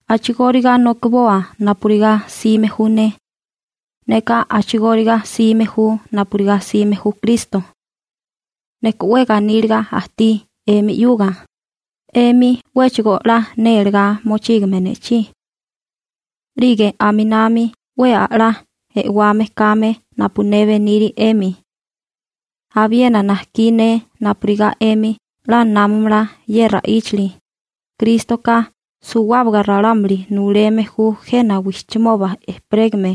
A'chigóriga nokiboa napurigá 'sime ju ne. Neka a'chigóriga 'sime ju napurigá 'sime ju Kristo. Neka 'we ganíliga ajtí 'emi 'yuga, 'emi 'wéchigo 'la nélegá mochígame ne'chí. 'Lige aminami 'we a'lá e'wame kame napu ne beniri 'emi. Abiena najkí ne napurigá 'emi 'la námamala ye ra'íchali: Krístoka suwábaga ralámuli nuleme ju jena wijchimoba ejperégame,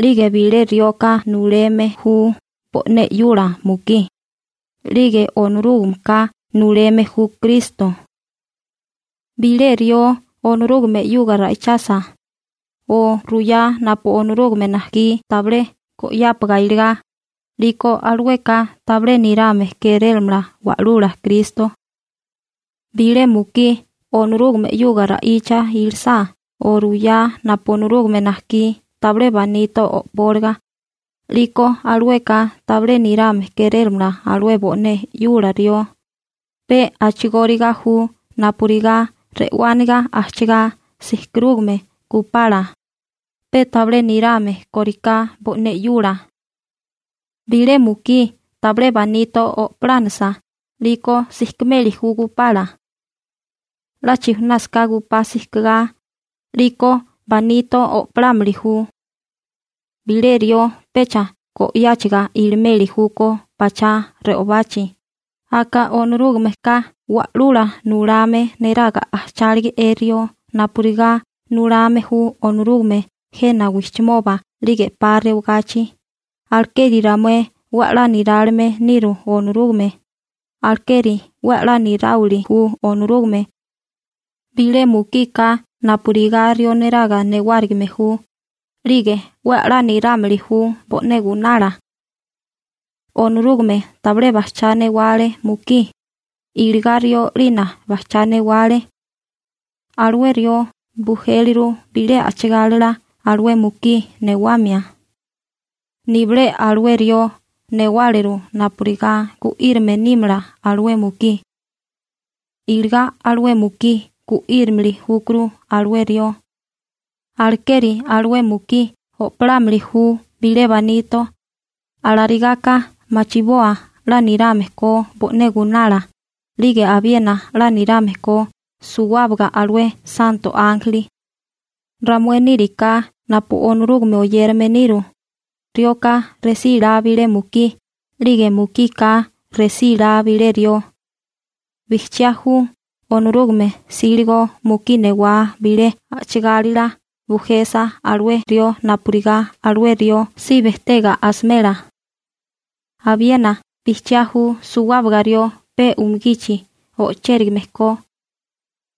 'lige bilé rioka nuleme ju bo'né 'yula mukí, 'lige Onorúgameka nuleme ju Kristo. Bilé rió Onorúgame 'yuga ra'ichasa, o ruyá napu Onorúgame najkí tabilé go'yápaga iligá, 'liko alueka tabilé nirame kérélamala Wa'lula Kristo. Bilé mukí Onorúgame 'yuga ra'icha ilisá o ruyá napu Onorúgame najkí tabilé banito o'póliga, 'liko alueka tabilé nirame kérélamala alué bo'né 'yula rió, pe a'chigóriga ju napurigá re'wániga ajchigá sijkarúgame gupala pe tabilé nirame kóriká bo'né 'yula. Bilé mukí tabilé banito o'polánisa, 'liko sijkimeli ju gupala. 'La chijunásaká gupá sijkigá, 'liko banito o'polámili ju. Bilé rió pecha go'yáchiga ilimeli júkó pachá re'obachi, aka Onorúgameka wa'lula nulame neraga ajchálige'é rió napurigá nulame ju Onorúgame jena wijchimoba 'lige 'pa rewagachi, alekeri ramué 'we 'la nirálime niru Onorúgame, alekeri 'we 'la niráwili ju Onorúgame. Bilé mukika napurigá rió neraga newárigime ju, 'lige 'we 'la nirámili ju bo'né gunala. Onorúgame tabilé bajchá newale mukí, iligá rió 'lina bajchá newale. Alué rió bujéliru bilé a'chigálila alué mukí newamia. Nibilé alué rió newáleru napurigá gu'írame nímala alué mukí. Iligá alué mukí gu'írimili júkuru alué rió. Alekeri alué mukí o'polámili ju bilé banito, alarigaka machiboa 'la nirame ko bo'né gunala 'lige abiena 'la nirame ko suwábaga alué santo ánjeli. Ramué níriká napu Onorúgame oyérame niru, rioka resílá bilé mukí, 'lige mukika resílá bilé rió. Bijchiá ju Onorúgame 'síligo mukí newá bilé a'chigálila bujesa alué rió napurigá alué rió si bejtega asimela. Abiena bijchiá ju suwábaga rió pe umugichi o'chérigame ko.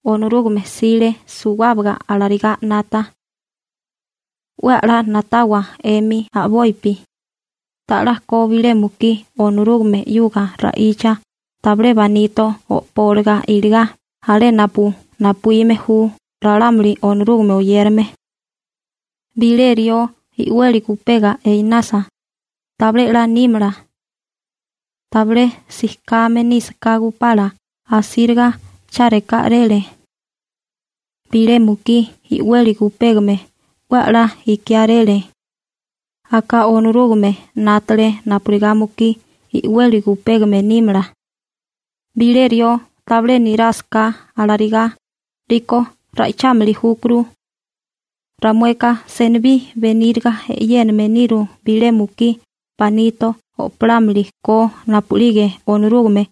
Onorúgame 'sile suwábaga alarigá 'nata. 'We a'lá na'tawa 'emi a'bopi. ¿Ta'lá ko bilé mukí Onorúgame 'yuga ra'icha tabilé banito o'póliga iligá alé napu napuíme ju ralámuli Onorúgame oyérame? Bilé rió i'weli gujpega einasa, tabilé 'la nímala. Tabilé sijkame nísaká gupala asíriga chárikáréle. Bilé mukí i'weli gupégame 'we a'lá ikiáréle. Aka Onorúgame 'nátale napurigá mukí i'weli gujpégame nímala. Bilé rió tabilé nirásaká alarigá, 'liko ra'ichámili júkuru. Ramueka senibí beníriga e'yéname niru bilé mukí banito o'polámili ko napu'lige Onorúgame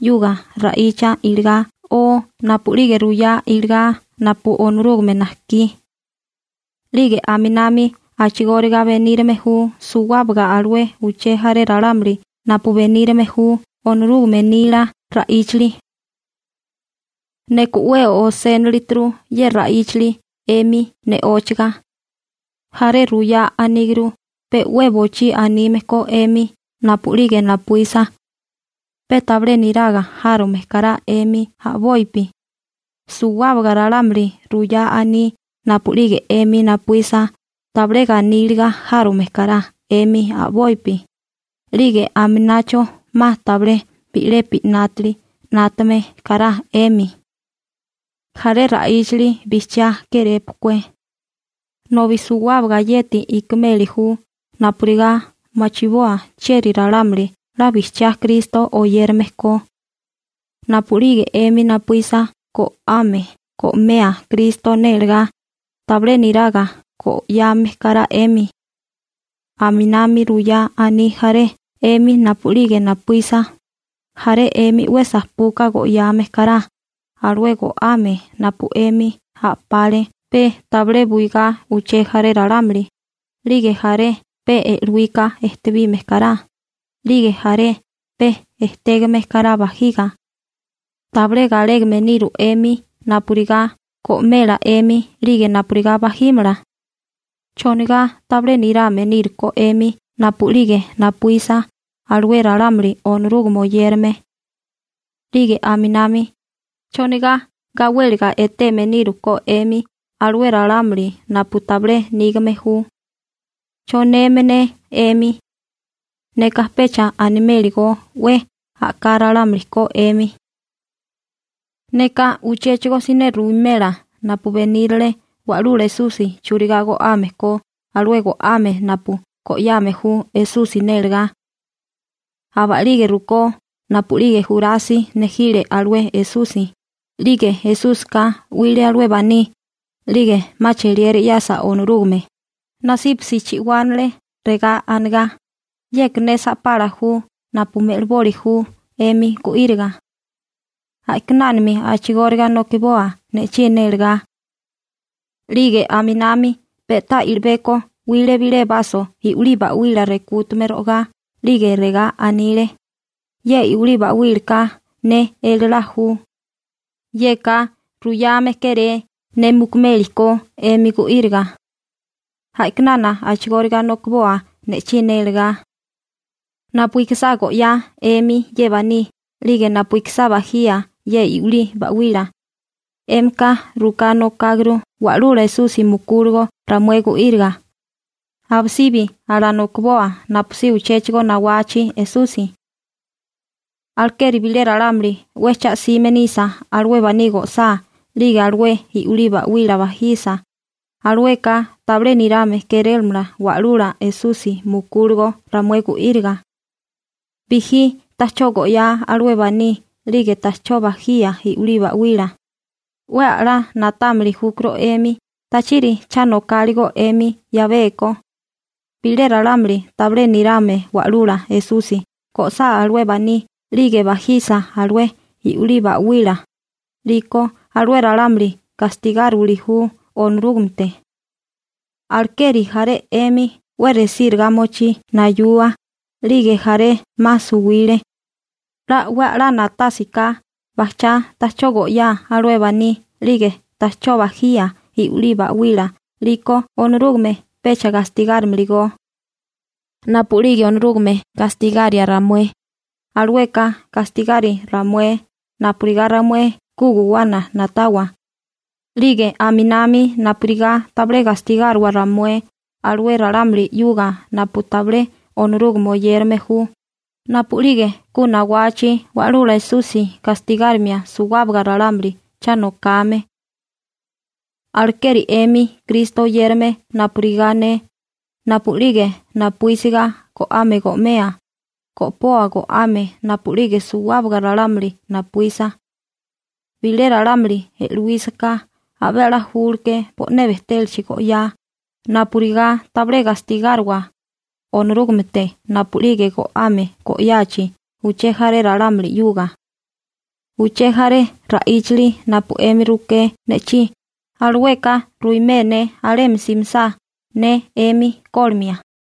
'yuga ra'icha iligá o napu'lige ruyá iligá napu Onorúgame najkí. 'Lige aminami a'chigóriga benírame ju suwábaga alué uché jaré ralámuli napu benírame ju Onorúgame nila ra'íchali. Neka 'we osénilituru ye ra'íchali 'emi ne'óchaga. Jaré ruyá aníguru pe 'we bochí anime ko 'emi napu'lige napuísa. Pe tabilé niraga járome kará 'emi a'bopi. Suwábaga ralámuli ruyá aní napu'lige 'emi napuísa tabilé ganíliga járome kará 'emi a'bopi, 'lige aminacho 'ma tabilé bi'lepi 'nátali 'nátame kará 'emi. Jaré ra'íchali bijchiá kérépukué. Nobi suwábaga yeti ikimeli ju napurigá machiboa chieri ralámuli 'la bijchiá Kristo oyérame ko. Napu'lige 'emi napuísa go'ame go'mea Kristo nélegá, tabilé niraga go'yame kará 'emi. Aminami ruyá aní jaré 'emi napu'lige napuísa, jaré 'emi 'we sapuka go'yame kará alué go'ame napu 'emi a'pale pe tabilé buigá uché jaré ralámuli, 'lige jaré pe e'luíka ejtebime kará, 'lige jaré pe etégame kará bajiga. ¿Tabilé galégame niru 'emi napurigá go'mela 'emi 'lige napurigá bajímala? ¿Chonigá tabilé nirame nírukó 'emi napu'lige napuísa alué ralámuli Onorúgame oyérame? 'Lige aminami, ¿chonigá gawéliga eteme níruko 'emi alué ralámuli napu tabilé nígame ju? ¿Choneme ne 'emi? Neka pecha animeli go 'we a'ká ralámuli ko 'emi. Neka uchéchigo siné ruwimela napu benírale Wa'lula Esusi churigá go'ame ko alué go'ame napu go'yame ju Esusi nélegá. Aba'lige rukó napu'lige Jurasi nejile alué Esusi, 'lige Esúsika 'wile alué baní, 'lige 'ma cheliera 'yasa Onorúgame, nasípasi chi'wánale regá anigá: «Yeka ne sa'pala ju napu me'liboli ju 'emi gu'íriga. A'kinánami a'chigóriga nokiboa ne'chí nélegá.» 'Lige aminami pe'tá i'libeko 'wile bilé baso i'wilí ba'wila rekútame ro'agá 'lige regá anile: «Ye i'wilí ba'wílaka ne elalá ju. Yeka ruyame kéré ne mukumeli ko 'emi gu'íriga. A'kinana a'chigóriga nokiboa ne'chí nélagá.» Napu ikisá go'yá 'emi ye baní 'lige napu ikisá bajía ye i'wilí ba'wila, 'émika ruká nokáguru Wa'lula Esusi mukúligo ramué gu'íriga. Abisibi alanokiboa napusí uchéchigo nawachi Esusi. Alekeri bilé ralámuli 'we cha 'sime nisa alué baní go'sá 'lige alué i'wilí ba'wila bajisa, alueka tabilé nirame kérélamala Wa'lula Esusi mukúligo ramué gu'íriga. Bijí ta'chó go'yá alué baní 'lige ta'chó bajía i'wilí ba'wila, 'we 'la na'támili júkuru 'emi tachiri cha nokáligo 'emi 'yabeko. Bilé ralámuli tabilé nirame Wa'lula Esusi go'sá alué baní 'lige bajisa alué i'wilí ba'wila, 'liko alué ralámuli gastigáriwili ju Onorúgamete. Alekeri jaré 'emi 'we resíriga mochí nayua, 'lige jaré 'ma suwile. 'La 'we a'lá na'tásiká bajchá ta'chó go'yá alué baní 'lige ta'chó bajía i'wilí ba'wila 'liko Onorúgame pecha gastigárimili go. Napu'lige Onorúgame gastigaria ramué, alueka gastigari ramué napurigá ramué ku guwana na'tawa 'lige aminami napurigá tabilé gastigáriwa ramué alué ralámuli 'yuga napu tabilé Onorúgame oyérame ju, napu'lige ku nawachi Wa'lula Esusi gastigárimia suwábaga ralámuli cha nokame. Alekeri 'emi Kristo oyérame napurigá ne, napu'lige napuísiga go'ame go'mea, go'poa go'ame napu'lige suwábaga ralámuli napuísa. Bilé ralámuli e'luísaká, abé 'la ju bo'né bejtélachi go'yá, napurigá tabilé gastigáriwa Onorúgamete napu'lige go'ame go'yachi uché jaré ralámuli 'yuga. Uché jaré ra'íchali napu 'emi ruké ne'chí, alueka ruimé ne alemi simisá ne 'emi kólimia.